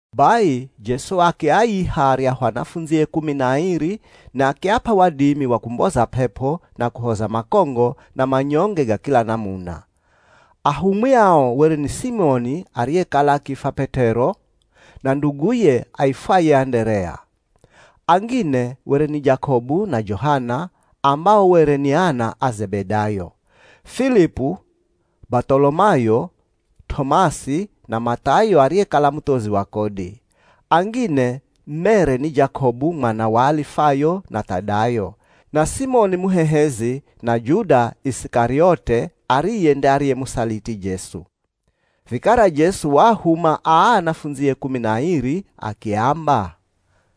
Bai Jesu akiaiha aryahu anafundzie kumi na airi na akiap'a wadimi wa kumboza p'ep'o na kuhoza makongo na manyonge ga kila namuna. Ahumwi ao were ni Simoni ariyekala akiifwa P'et'ero na nduguye aifwaye Anderea. Angine were ni Jakobu na Johana, ambao were ni ana a Zebedayo, Filipu, Bath'olomayo, T'omasi, na Math'ayo ariyekala muthozi wa kodi. Angine mere ni Jakobu mwana wa Alifayo, na Th'adayo, na Simoni Muhehezi, na Juda Isikariote ariye nde ariyemusaliti Jesu. Vikara Jesu waahuma aa anafundzie kumi na airi akiamba,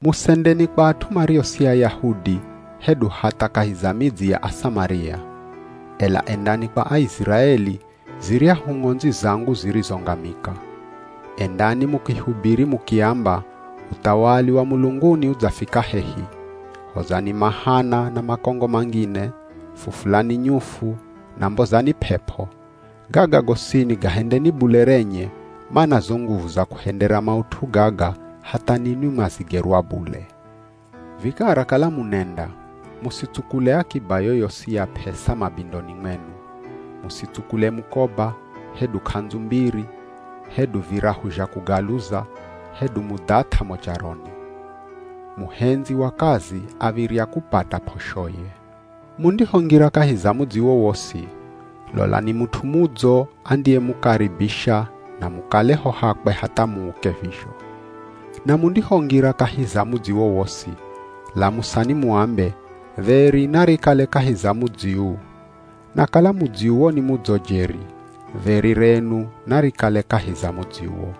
“Musendeni kwa at'u mario si Ayahudi, hedu hatha kahi za midzi ya Asamaria. Ela endani kwa Aiziraeli, ziryahu ng'ondzi zangu zirizongamika. Endani mukihubiri mukiamba, uthawali wa mulunguni udzafika hehi. Hozani mahana na makongo mangine, fufulani nyufu, na mbozani p'ep'o. Gaga gosini gahendeni bule renye, mana zo nguvu za kuhendera maut'u gaga hatha ninwi mwazigerwa bule. Vikara kala munenda, musitsukule akiba yoyosi ya p'esa mabindoni mwenu. Musitsukule mukoba, hedu k'andzu mbiri, hedu virahu zha kugaluza, hedu mudhath'a mo charoni.” “Muhendzi wa kazi av̱irya kupata p'oshoye. Mundihongira kahi za mudzi wowosi, lolani mut'u mudzo andiyemukaribisha na mukale ho hakwe hatha muuke vizho. Na mundihongira kahi za mudzi wowosi, lamusani muambe, ‘Dheri narikale kahi za mudzi uu.’ Na kala mudzi uwo ni mudzo jeri, dheri renu narikale kahi za mudzi uwo.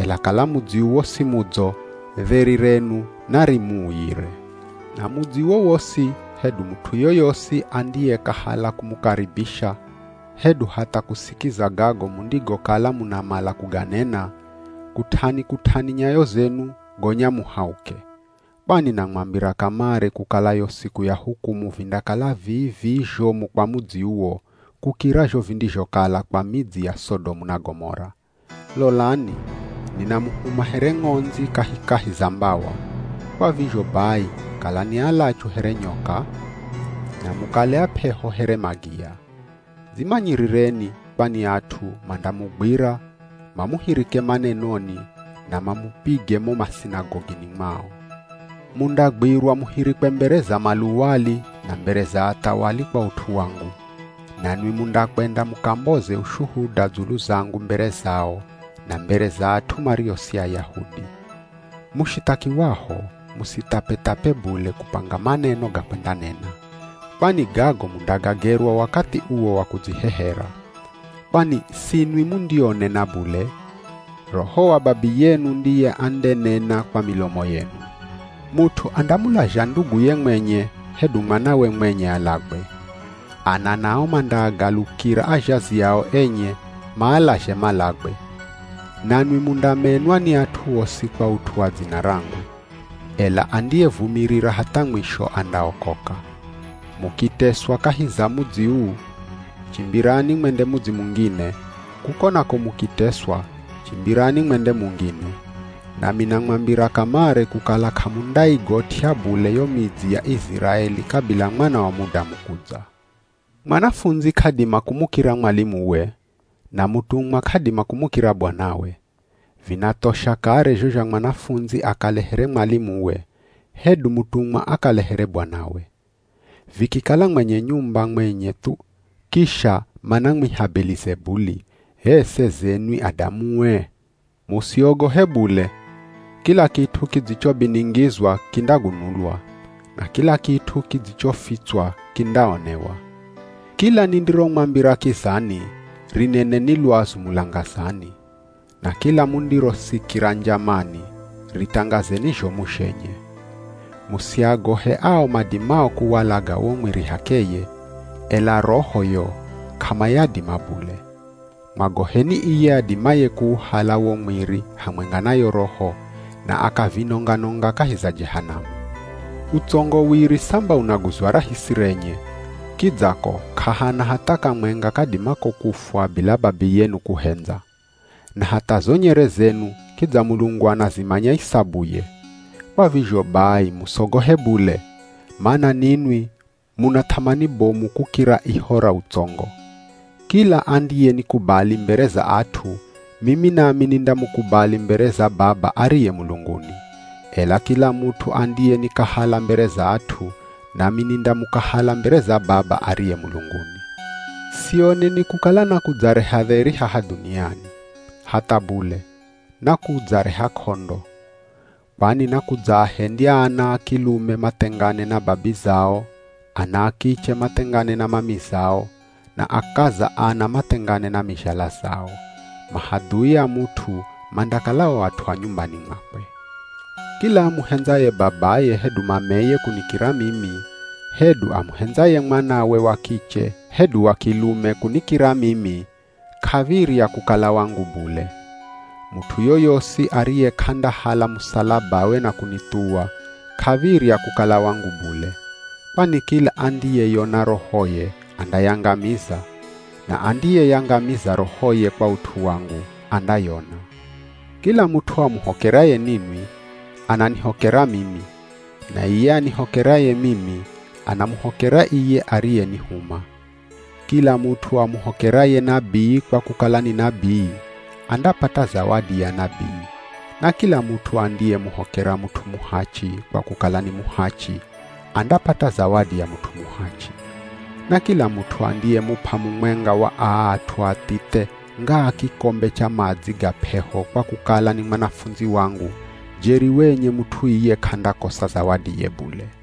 Ela kala mudzi uwo si mudzo, dheri renu narimuuyire. Na mudzi wowosi, hedu mut'u yoyosi andiyekahala kumukaribisha, hedu hatha kusikiza gago mundigokala munamala kuganena, kut'ani-kut'ani nyayo zenu, gonya muhauke. Kwani namwambira kamare kukala yo siku ya hukumu vindakala vii-vii zhomu kwa mudzi uwo, kukira zho vindizhokala kwa midzi ya Sodomu na Gomora.” “Lolani, ninamuhuma here ng'ondzi kahikahi za mbawa. Kwa vizho bai kalani alachu here nyoka, na mukale ap'eho here magiya. Dzimanyirireni kwani at'u mandamugwira mamuhirike manenoni na mamupige mo masinagogini mwao. Mundagwirwa muhirikwe mbere za maluwali na mbere za athawali kwa ut'u wangu, nanwi mundakwenda mukamboze ushuhuda dzulu zangu mbere zao, na mbere za at'u mario si Ayahudi. Mushithakiwaho, musithapethape bule kupanga maneno ga kwendanena, kwani gago mundagagerwa wakathi uwo wa kudzihehera. Kwani sinwi mundionena bule, Roho wa Babiyenu ndiye andenena kwa milomo yenu.” “Mut'u andamulazha nduguye mwenye hedu mwanawe mwenye alagwe. Ana nao mandaagalukira azhazi ao enye, maalazhe malagwe. Nanwi mundamenwa ni at'u osi kwa ut'u wa dzina rangu. Ela andiyevumirira hatha mwisho andaokoka. Mukiteswa kahi za mudzi uu, chimbirani mwende mudzi mungine, kuko nako mukiteswa, chimbirani mwende mungine. Nami namwambira kamare kukala k'amundaigot'ya bule yo midzi ya Iziraeli kabila Mwana wa Mudamu kudza.” “Mwanafundzi k'adima kumukira mwalimuwe, na mutumwa k'adima kumukira bwanawe. Vinathosha kare zho zha mwanafundzi akale here mwalimuwe, hedu mutumwa akale here bwanawe. Vikikala mwenye nyumba mwenye thu, kisha manamwiha Belizebuli, h'e seze nwi adamue?” “Musiogohe bule, kila kit'u kidzichobiningizwa kindagunulwa, na kila kit'u kidzichofitswa kindaonewa. Kila nindiromwambira kizani, rineneni lwazu mulangazani. Na kila mundirosikira njamani, ritangazeni zhomu zhenye. Musiagohe ao madimao kuwalaga wo mwiri h'akeye, ela roho yo, k'amayadima bule. Mwagoheni iye adimaye kuuhala wo mwiri hamwenga na yo roho, na akavinonga-nonga kahi za Jehanamu. Utsongo wiri samba unaguzwa rahisi renye, kidza ko k'ahana hatha kamwenga kadimako kufwa bila Babiyenu kuhendza. Na hatha zo nyere zenu kidza Mulungu anazimanya isabuye. Kwa vizho bai musogohe bule, mana ninwi muna th'amani bomu kukira iho ra utsongo. “Kila andiyenikubali mbere za at'u, mimi nami nindamukubali mbere za Baba ariye mulunguni. Ela kila mut'u andiyenikahala mbere za at'u, nami nindamukahala mbere za Baba ariye mulunguni.” “Sioneni kukala nakudzareha dheri haha dhuniani, hatha bule, nakudzareha k'ondo. Kwani nakudzaahendya ana a kilume mathengane na babizao, ana a kiche mathengane na mamizao, na akaza ana mathengane na mizhala zao. Mahadhui a mut'u mandakala o at'u a nyumbani mwakwe.” “Kila amuhendzaye babaye hedu mameye kunikira mimi, hedu amuhendzaye mwanawe wa kiche hedu wa kilume kunikira mimi, k'av̱irya kukala wangu bule. Mut'u yoyosi ariye k'andahala musalabawe na kunithuwa, k'av̱irya kukala wangu bule. Kwani kila andiyeyona rohoye andayangamiza, na andiyeyangamiza rohoye kwa ut'u wangu, andayona.” “Kila mut'u amuhokeraye ninwi, ananihokera mimi, na iye anihokeraye mimi, anamuhokera iye ariyenihuma. Kila mut'u amuhokeraye nabii kwa kukala ni nabii, andapata zawadi ya nabii, na kila mut'u andiyemuhokera mut'u muhachi, kwa kukala ni muhachi, andapata zawadi ya mut'u muhachi. Na kila mut'u andiyemup'a mumwenga wa aa at'u athithe, ngaa kikombe cha madzi ga p'eho kwa kukala ni mwanafundzi wangu, jeri wenye mut'u iye k'andakosa zawadiye bule.”